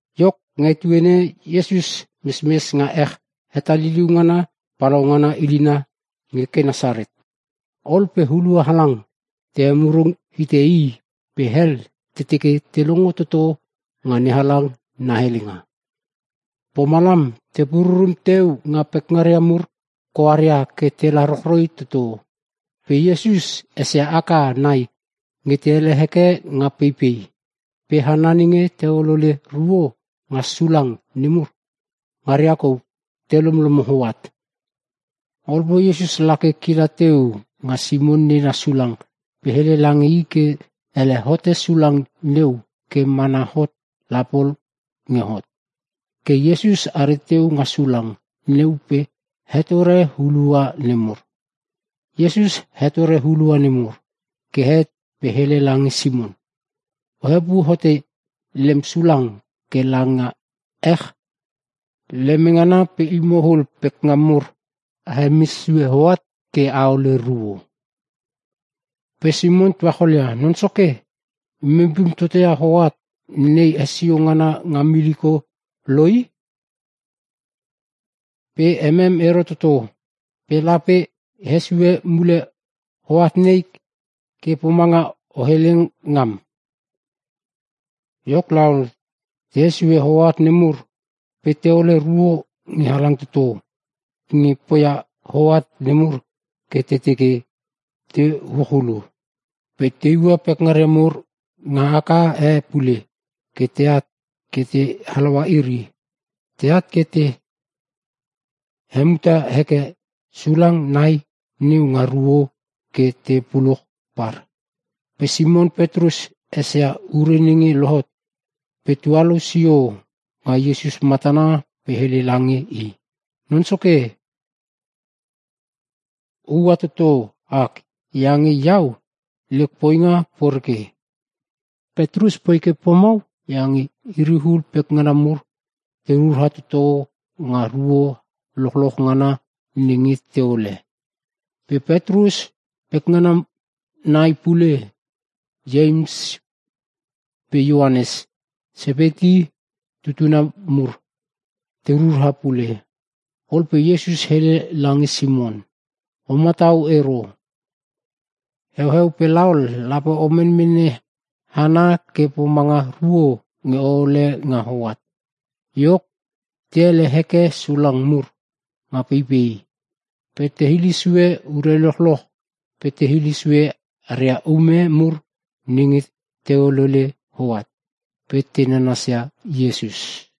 Iok, nga etuene e Iesus mesmes nga ech hetaliliu ngana palaungana ililna nge Kenesaret. Ol pe hulua halang te emurung hite i pe hel te teke te longo toto nga NeHalang na helenga. Pomalam te pururum teu nga pekngaria mur koaria ke tela rochroi toto. Pe Iesus esia aka nai nge te ele heke nga peipei. Pe hana nenge te olole ruo nga sulang nemur ngaria kou te lomlomo hoat. Ol pe Iesus lake kila teu nga Simon nena sulang pe hele lange i ke ele hote sulang neu ke mana hot la pol nge hot. Ke Iesus are teu nga sulang neu pe hetore hulua nemur. Iesus hetore hulua nemur ke het pe hele lange Simon, “O hepu hote lem sulang ke lange ech leme ngana pe imo ul pekngam mur a hemes sue hoat ke a hole ruo.” Pe Simon tuacholia, “Non Soke, imem pum toto ia hoat nei hesio ngana nga miliko lo i! Pe emem ero toto. Pe lape e hesio mule hoat nei ke pomanga o hele ngam.” Iok laol, te hesue hoat nemur pe te hole ruo nge halang toto nge poia hoat nemur ke te teke te uch ulu. Pe te iua pekngaria mur nga aka e pule ke teat ke te halaua iri. Teat ke te hemuta heke sulang nai neu nga ruo ke te puluch par. Pe Simon Petrus esia ure nenge lohot pe tualou sio nga Iesus matana pe hele lange i, “Non Soke oua toto ak iange iau lek poinga poreke!” Petrus poi ke pomau iange iri ul pekngana mur te rura toto nga ruo lochloch ngana nenge teole. Pe Petrus pekngana nai pule Ieims pe Ioanes Sepeti tutuna mur te rura pule. Ol pe Iesus hele lange Simon, “O matau ero. Heueu pe laol lape o menmene hana ke pomanga ruo nge o hole nga hoat.” Iok, te ele heke sulang mur nga peipei pe te hile sue ure lochloch pe te hile sue aria ume mur nenge te holole hoat pe te nanasia Iesus.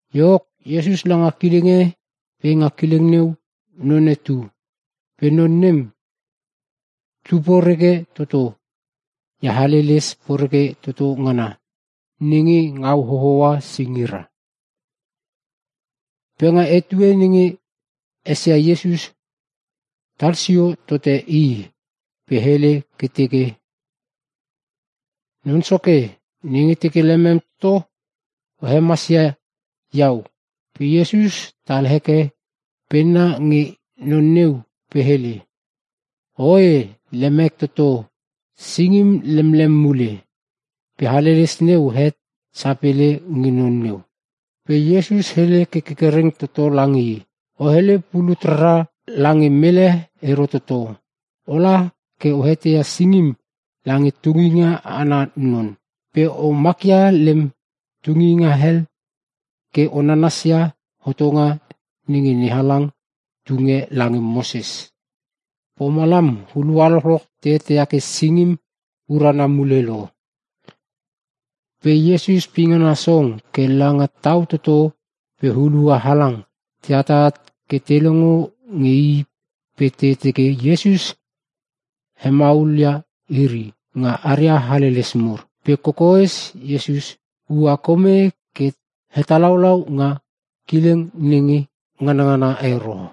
Iok, Iesus langa kileng e pe nga kileng neu none tu. Pe non nem tu poreke toto ia haleles poreke toto ngana nenge ngau hohoa singira. Pe nga etue nenge esia Iesus talsio tote i pe hele ke teke, “Non Soke, nenge teke lemem toto o hemasia iau!” Pe Iesus tal heke penna nge non neu pe hele, “Oe lemek toto. Singim lemlem mule!” Pe haleles neu het sapele nge non neu. Pe Iesus hele ke kerkereng toto lange i, “O hele pulut rara lange mele ero toto. Ola ke o heteia singim lange tunginga ana non. Pe o makia lem tunginga hel ke o nanasia hotonga nenge NeHalang tunge lange Moses. Pomalam hulua lochlolch te eteia ke singim urana mule lo.” Pe Iesus pingana song ke langa tau toto pe hulua halang te atat ke te longo nge i pe te teke Iesus hemaulia iri nga aria haleles mur. Pe kokoes Iesus ua kome ke hetalaulau nga kileng nenge nganangana ero.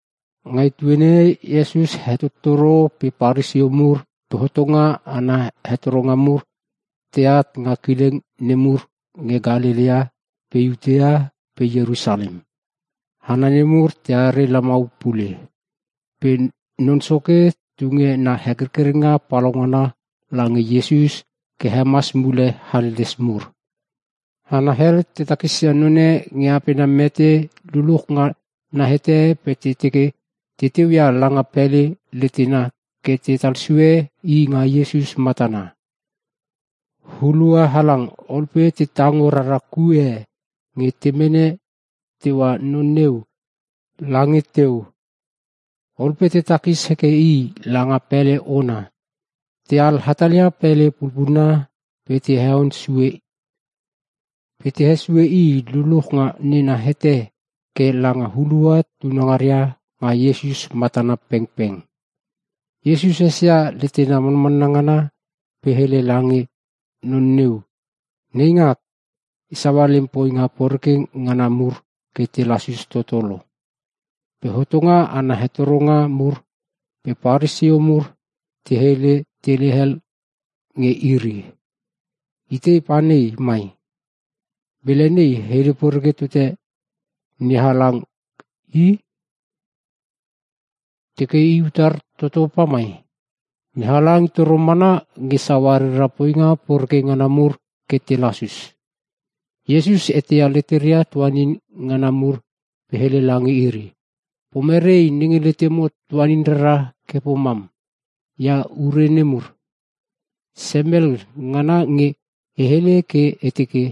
Nga etuene e Iesus hetottoro pe Paresio mur pe hotonga ana hetoronga mur teat nga kileng nemur nge Kalelea pe Iutea pe Ierusalem. Hana nemur teare lamau pule. Pe Non Soke tunge na hekerkerenga palaungana lange Iesus ke hemas mule haleles mur. Hana hel te takisia none nge apena mete luluch nga na hete pe te teke te teuia langa pele letena ke tetal sue i nga Iesus matana. Hulua halang ol pe te tango rara kue e nge te mene teua non neu lange teu. Ol pe te takis heke i langa pele ona teal hatalia pele pulpulna pe te heon sue pe te hesue i luluch nga nena hete ke langa hulua tunangaria nga Iesus matana pengpeng. Iesus esia leteria manmanna ngana pe hele lange non neu, “Neingak, e saua lem poinga poreke ngana mur ke te lasus toto lo.” Pe hotonga ana hetoronga mur pe Paresio mur te hele te hele hel nge iri, “Itei pane mai? Mele nei hele poreke tote NeHalang i! Teke i utar toto pamai? NeHalang i toro mana nge saua rera poinga poreke ngana mur ke te lasus!” Iesus eteia leteria tuanin ngana mur pe hele lange iri, “Pomere nenge letemo tuanin rara ke pomam ia ure nemur? Semel ngana nge e hele ke e teke,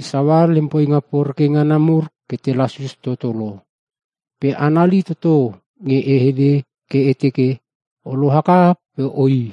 ‘E saua lem poinga poreke ngana mur ke te lasus toto lo.’ Pe anali toto nge e hele ke e teke ‘O loaka pe oi.’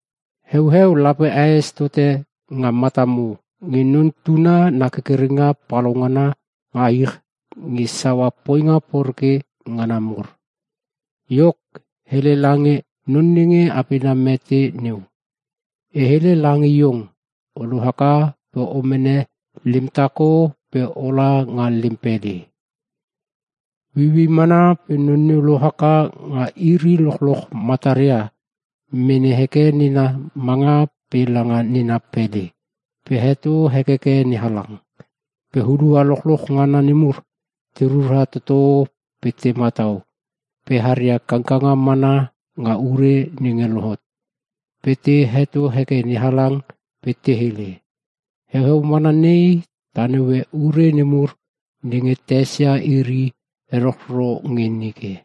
Heueu lape aes tote nga matamo nge Non Tuna na kerkerenga palaungana nga ich nge saua poinga poreke ngana mur.” Iok, hele lange non nenge apena mete neu, “E hele lange iong, o lohaka pe o mene lem tako pe ola nga lem pele!” Ueiuei mana pe non neu lohaka nga iri lochloch mataria mene heke nena manga pe langa nena pele pe heto hekeke NeHalang. Pe hulua lochloch ngana nemur te rura toto pe te matau pe haria kangkanga mana nga ure nenge lohot pe te heto heke NeHalang pe te hele, “Heueu mana nei ta naue ure nemur nenge ta esia iri erochro nge nike.”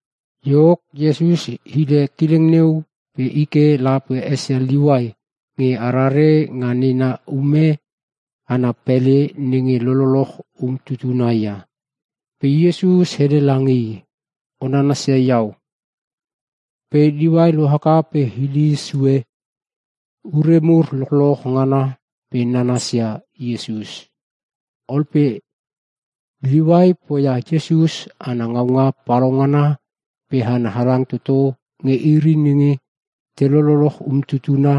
Iok, Iesus hile kileng neu pe i ke la pe esia Liuai nge arare nga nena ume ana pele nenge lololoch umtutuna ia.Pe Iesus hele lange i, “O nanasia iau.” Pe Liuai lohaka pe hile sue ure mur lochloch ngana pe nanasia Iesus. Ol pe Liuai poia Iesus ana ngaunga palaungana pe hana halang toto nge iri nenge te lololoch umtutuna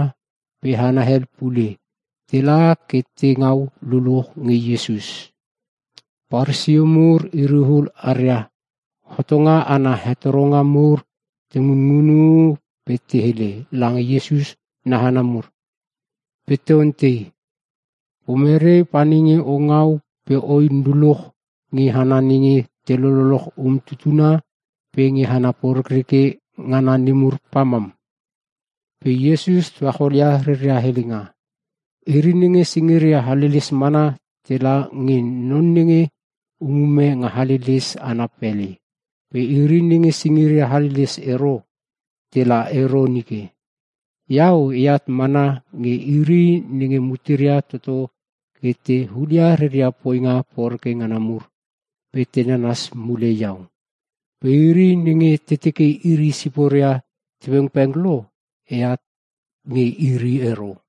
pe hana hel pule tela ke te ngau luluch nge Iesus. Paresio mur iri ul aria hotonga ana hetoronga mur te ngunngunu pe te hele lange Iesus na hana mur. Pe te ontei, “Pomere pa nenge o ngau pe oin luluch nge hana nenge te lololoch umtutuna pe nge hana porekreke ngana nemur pamam?” Pe Iesus tuacholia reria helenga, “Iri nenge singiria haleles mana tela nge non nenge umume nga haleles ana pele pe iri nenge singiria haleles ero tela ero nike. Iau eat mana nge iri nenge muteria toto ke te hulia reria poinga poreke ngana mur pe te nanas mule iau. Pe iri nenge te teke iri siporia te pengpeng lo eat nge iri ero.”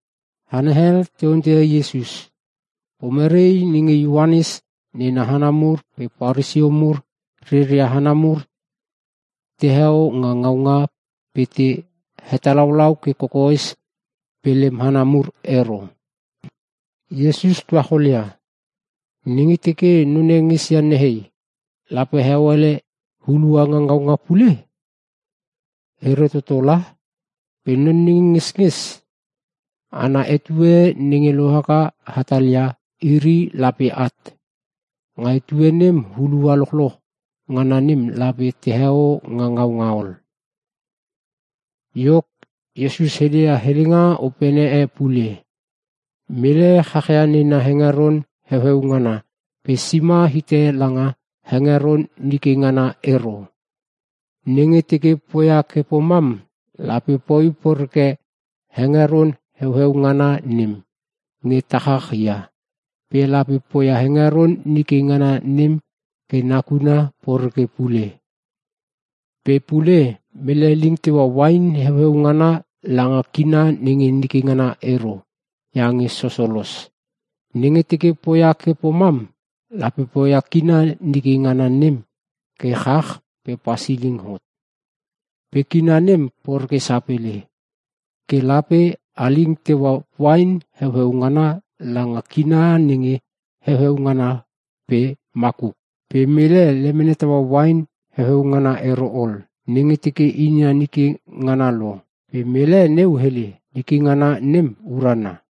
Hana hel te onteia Iesus, “Pomere nenge Ioanes nena hana mur pe Paresio mur reria hana mur teheo nga ngaunga pe te hetalaulau ke kokoes pe lem hana mur ero?” Iesus tuacholia, “Nenge teke none ngesia nehei, lape heo ele hulua nga ngaunga pule? Ero toto la! Pe non nenge ngesnges ana etue nenge lohaka hatalia iri lape at. Nga etue nem hulua lochloch ngana nem lape teheo nga ngaunga ol.” Iok, Iesus heleia helenga opene e pule, “Mele chach ia nena hengeron heueu ngana pe sima hite langa hengeron nike ngana ero. Nenge teke poia ke pomam lape poi poreke hengeron heueu ngana nem nge tachach ia. Pe lape poia hengeron nike ngana nem ke nakuna poreke pule. Pe pule mele ling teua uain heueu ngana langa kina nenge nike ngana ero iange sosolos. Nenge teke poia ke pomam lape poia kina nike ngana nem ke chach pe pasiling hot, pe kina nem poreke sapele. Ke lape a ling teua uain heueu ngana langa kina nenge heueu ngana pe makuk. Pe mele lemene taua uain heueu ngana ero ol nenge teke inia nike ngana lo. Pe mele neu hele, ‘Nike ngana nem urana.’”